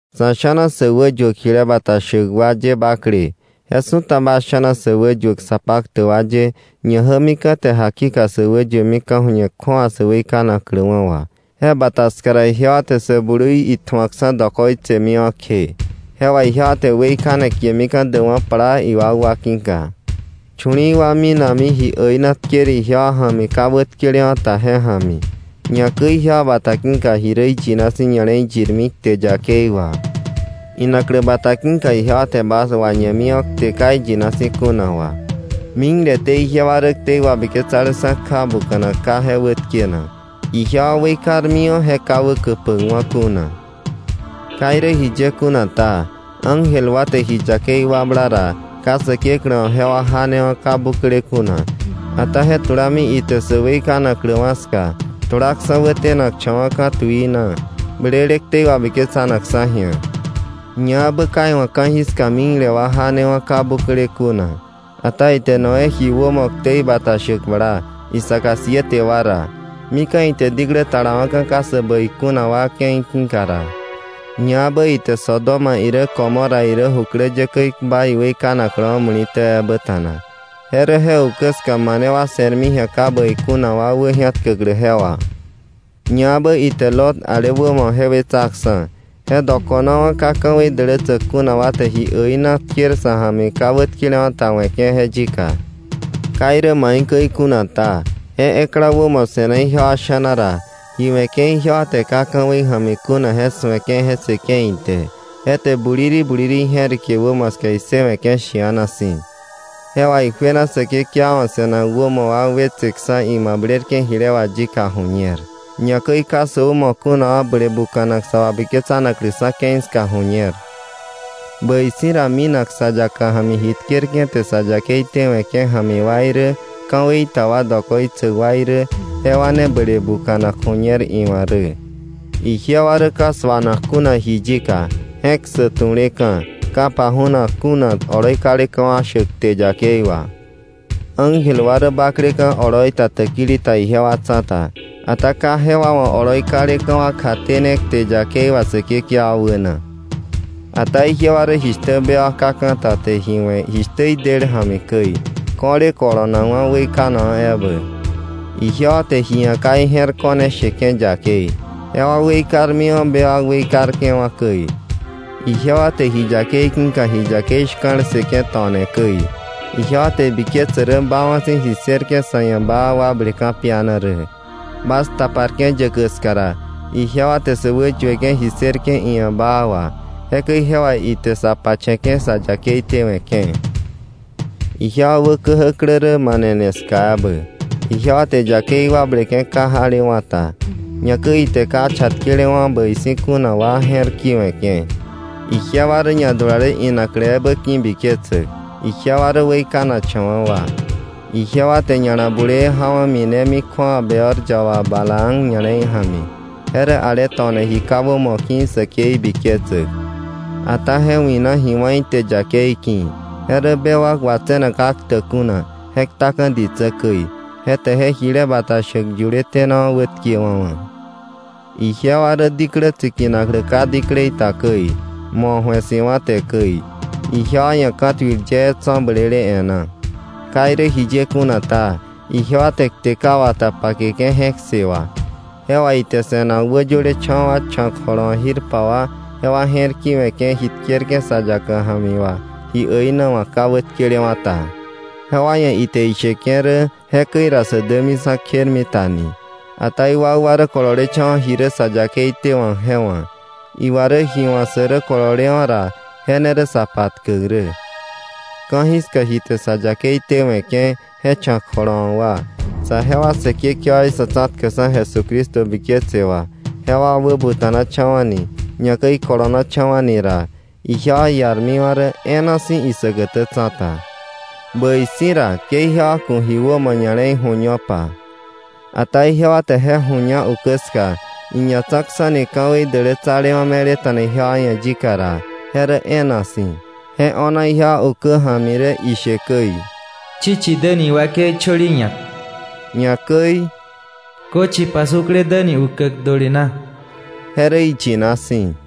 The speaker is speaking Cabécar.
Sa̱ sha̱na sä wäyuäk jile bata shäk wa ye bakle, je su̱ta bas sha̱na sä wäyuäk sa paktäk wa ye, ñajämika̱ te jakika sä wäyuemi ka̱ju̱ñe kju̱awa sä weikanakläwa̱ wà, je bata ska ra, ijewa te Sä Blui itju̱akksa̱ dokoitsemiwa̱ kje. Je wà ijewa te weikane kiemika̱ däkwa̱ plaa iwakwa ki̱ka. Chu̱li̱i̱ wa minami ji äina tker ijewa ja̱mi ka wätkelewa̱ ta, je ja̱mi. Ñakäi ijewa bata ki̱ka ji rä iyina si̱ ña̱le̱i yirmi kte yakei wà. Inaklä bata ki̱ka ijewa te bas wañemiwa̱ kte ka iyina si̱ kuna wà. Mikleté ijewa rä ktei wabiketsaleksa̱ kja buka̱nak ka je wätkenak, ijewa weikarmiwa̱ je ka wäkäpäkwa̱ kuna. Ka irä jiye kuna ta, ángel wa te ji yakei wakbla ra ka Säkeklä wa̱ jewa janewa̱ ka bukle kuna, ata je tulami ite sä weikanakläwa̱ ska, tulaksa̱ wätenakcha̱wa̱ ka̱ tuii na, blele ktei wabiketsanakksa̱ ji̱a. Ñaebä ka iwa̱ ka̱jiska mikle wa janewa̱ ka bukle kuna. Ata ite Noé ji wämo ktei bata shäk bla, isaka siete wa ra, mika̱ ite diklä talawa̱ka ka sä bäi kuna wa ke̱i ki̱ka ra. Ñaebä ite Sodoma irä Gomorra irä jukläyäkäí kpa iweikanakläwa̱ muli̱tä ebä ta̱na, je rä je ukä ska mane wa se̱rmi ji̱a ka bäi kuna wa wäji̱atkäklä je wà. Ñaebä ite Lot ale wämo je wetsaksa̱. Je dokonawa̱ ka ka̱wei dälätsäk kuna wa te ji äina tker sa̱ ja̱mi ka wätkelewa̱ ta we̱ke̱ je yika. Ka irä jiye kuna ta, je ekla wämo se̱na ijewa sha̱na ra, ji we̱ke̱ ijewa te ka ka̱wei ja̱mi kuna je su̱eke̱ je ssëke̱ ite, je te buliri buliri ije̱rike wämo ska issëwe̱ke̱ shi̱ana si̱. Je wà ijuena Säkekewa wa̱ se̱nak wämo wa wetseksa̱ imablerke̱ jile wà yika ju̱ñer, ñakäi ka sä wämo kuna wa ble buka̱nak sa wabiketsanakläksa̱ ke̱i ska ju̱ñer; bäi si̱ ra minak sa yaka ja̱mi ji tkerke̱ te sa yakei tewe̱ke̱ ja̱mi wa irä, ka̱wei ta wa dokoitsäk wa irä jewa ne ble bukanak ju̱ñer iwa̱ rä. Ijewa rä ka suanak kuna ji yika, je̱k ssäk tuleka̱, ka paju̱nak kuna oloi kaleka̱ wa shäk kte yakei wà. Ángel wa rä bakleka̱ oloi ta täkili ta ijewa tsa̱ta, ata ka jewa wa̱ oloi kaleka̱ wa kjatene kte yakei wà Säkekewa wäna. Ata ijewa rä jishtä bewak ka ka̱ ta te ji we̱ jishtä idel ja̱mi käi, ko̱le kolonakwa̱ weikanakwa̱ ebä. Ijewa te ji ia̱ ka ije̱r ko̱ne sheke̱ yakei, jewa weikarmiwa̱ bewak weikarke̱wa̱ käi. Ijewa te ji yakei ki̱ka ji yakei shka̱l ssëke̱ to̱ne käi. Je rä ijewa te ibiketse baawa̱ si̱ ji ssërke̱ sa̱ ia̱ baa wakble ka̱piana rä. Bas taparke̱ yäkäk ska ra, ijewa te sä wäyueke̱ ji ssërke̱ iia̱ baa wà, jekäi je wà ite sa pache̱ke̱ sa yakei tewe̱ke̱. Ijewa wä käjäklä rä manene ska ebä, ijewa te yakei wakbleke̱ ka jalewa̱ ta. Ñakäi ite ka chatkelewa̱ bäi si̱ kuna wa je̱r ki̱we̱ke̱. Ijewa rä ñadulale inaklä ebä ki̱biketsäk. Ijewa rä weikanakcha̱wa̱ wa. Ijewa te ña̱la bulee jawa̱ minemi kju̱awa Beor yaba Balaam ña̱le̱i ja̱mi, je rä ale to̱ne ji ka wämo ki̱ säkei biketsäk. Ata je wi̱na ji wá̱ ite yakei ki̱. Je rä bewak watse̱nak ka ktäk kuna, je ktaka̱ ditsä käi, je te je jile bata shäk yuletenawa̱ wätkewa̱wa̱. Ijewa rä diklä tsikinaklä ka diklei ta käi, mo̱ ju̱e si̱wa̱ te käi. Ijewa ia̱ ka̱tuil yee tso̱ blele e̱ná. Ka irä jiye kuna ta, ijewa te kte ka wata pakeke̱ je̱k ssë wà. Je wà ite se̱nak wäyölecha̱wa̱ wa cha̱k jolowa̱k jirpa wa, jewa je̱r ki̱we̱ke̱ ji tkerke̱ sa yaka ja̱mi wà ji äina wa̱k ka wätkelewa̱ ta. Jewa ia̱ ite isheke̱ rä jekäi ra sä dämiksa̱ kjermita ni. Ata iwakwa rä kololecha̱wa̱ ji rä sa yakei tewa̱k je wa̱. Iwa rä ji wa̱ sä rä kololewa̱ ra je ne rä sa patkäk rä. Ka̱jiska ji te sa yakei tewe̱ke̱, je cha̱k jolowa̱k wa, saje wa Säkekewaí Sa̱tsa̱tkäkksa̱ Jesucristo ju̱ñe wà, jewa wäbuta̱nacha̱wa̱ni, ñakäi ikolonacha̱wa̱ni ra, ijewa iarmiwa̱ rä e̱e̱na si̱ isäkätä tsa̱ta. Bäi si̱ ra, ke ijewa ku̱ ji wämo ña̱le̱i ju̱ñopa. Ata ijewa te je ju̱ña ukä ska, iñatsa̱kksa̱ni ka̱wei dälätsalewa̱ me̱leta̱na ijewa ia̱ yika ra, je rä e̱e̱na si̱. Je o̱na ijewa ukä ja̱mi rä ishe käi: “Chichi däni iwakei chöli ñak”, ñakäi, “Köchi pasukle däni ukäk döli na.” Je rä iyina si̱.